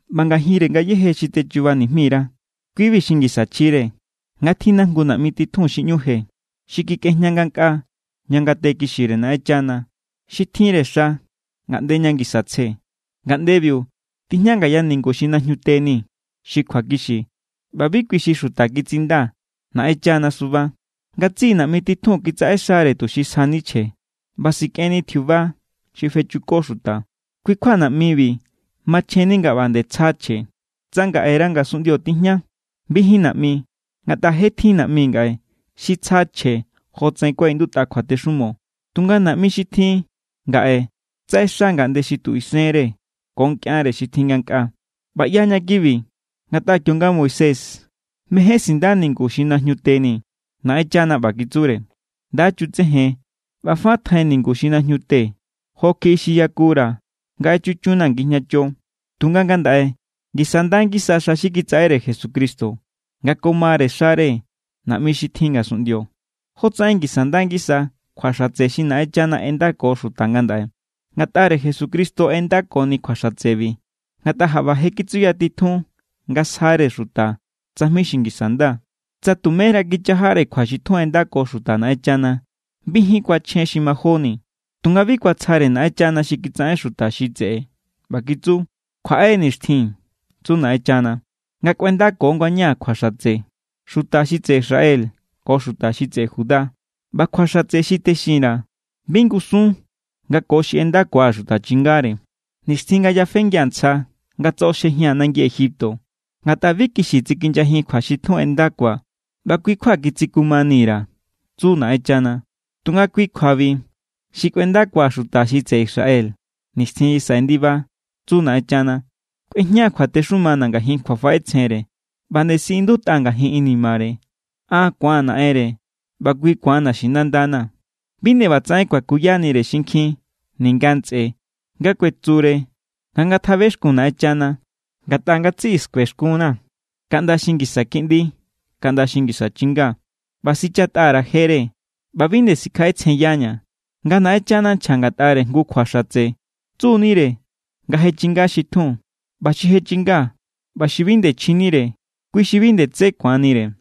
ꞌBa ngajinre ngayéje xi techuba nijmi_ra, kui=bi xi ngisa chjire: Nga tjinna jngu naꞌmi titjun xi ꞌñu je, xi kikꞌejña ngankꞌaa ña ngate kixire Naꞌenchana. Xi tjinre xa ngaꞌnde ña ngisa tsje. Ngaꞌndebiu tijña ngaya ningu xi najñute ni xi kjuakixi. ꞌBa bi kui xi xuta kitsinda, Naꞌenchana suba. Ngatsiꞌi naꞌmi titjun kitsaꞌexare tuxi sjani chje ꞌba sikꞌenni tjiuba xi fechuko xuta. Kui= kjua naꞌmibi machjenni nga ꞌba nde tsja chje. Tsa ngaꞌera ngasunꞌndio tijña, bijín naꞌmi, ngatꞌa je tjin naꞌmi ngaꞌe xi tsja chje jotsaꞌen kuaꞌindutꞌa kjuatexumo. Tunga naꞌmi xi tjin ngaꞌe tsaꞌexaya ngaꞌnde xi tu isenre ko nkꞌianre xi tjin ngankꞌaa. ꞌBa ꞌyaña kibi ngatꞌa kionga Moisés mején sinda ningu xi najñu teni, Naꞌenchana ꞌba kitsure: “Nda chutsejen. ꞌBa fa tjai ningu xi najñute jokjiꞌi xi yakura̱ nga echuchunnaa̱ ngijñacho.” Tunga ngandaꞌe ngisa= nda ngisa xa xi kitsaꞌere Jesucristo nga ko mare xare naꞌmi xi tjin ngasunꞌndio, jotsaꞌen ngisa nda ngisa kjua xatse xi Naꞌenchana ꞌendako xuta ngandaꞌe. Ngatꞌare Jesucristo ꞌendakoni kjua xatsebi ngatꞌa jaꞌba je kitsuyatitjun nga sjare xuta tsajmi xi ngisa nda. Tsa tuméra kichajare kjua xi tjun ꞌendako xuta Naꞌenchana, bijín kuachjen xi majóni. Tunga bi kuatsjare Naꞌenchana xi kitsaꞌen xuta xi tseꞌe ꞌba kitsu: Kjuaꞌe= nixtjin, tsu Naꞌenchana, nga kꞌuendako ngañaa̱ kjua xatse xuta xi tseꞌe Israel ko xuta xi tseꞌe Judá. ꞌBa kjua xatse xi texin_ra̱, bi ngusun nga ko xi ꞌendakua̱ xuta chingare, nixtjin nga yafengia̱ ntsja nga tsoꞌoxjejia̱n nangi Egipto. Ngatꞌa bi kixi tsikinyajin kjua xi tjun ꞌendakua̱, ꞌba kui= kjua kitsikumani_ra̱, tsu Naꞌenchana. Tunga kui kjuabi xi kꞌuendakua̱ xuta xi tseꞌe Israel nixtjin xi saꞌe ndiba, tsu Naꞌenchana. Kꞌuejñaa̱ kjuatexumana̱ ngajin kjuafaꞌetsjenre, ꞌba nde siꞌindutꞌa ngajin inimare. An ku̱aa̱n Naꞌenre, ꞌba kui ku̱an naxinandana̱. Bi nde ꞌbatsaꞌen kuakuyanire xinkjin ninga ntsꞌe, nga kuetsure nga ngatjabexkun Naꞌenchana. Ngatꞌa ngatsiꞌi skuexkunna̱, kaꞌnda xi ngisa kiꞌndi kaꞌnda xi ngisa chinga. ꞌBa sichatꞌa_ra̱ jere, ꞌba bi nde sikjaꞌetsjenyaña̱. Nga Naꞌenchana nchja ngatꞌare jngu kjua xatse, tsu=nire nga je chinga xi tjun. ꞌBa xi je chinga ꞌba xi bi nde chjinire, kui xi bi nde tsé ku̱anire.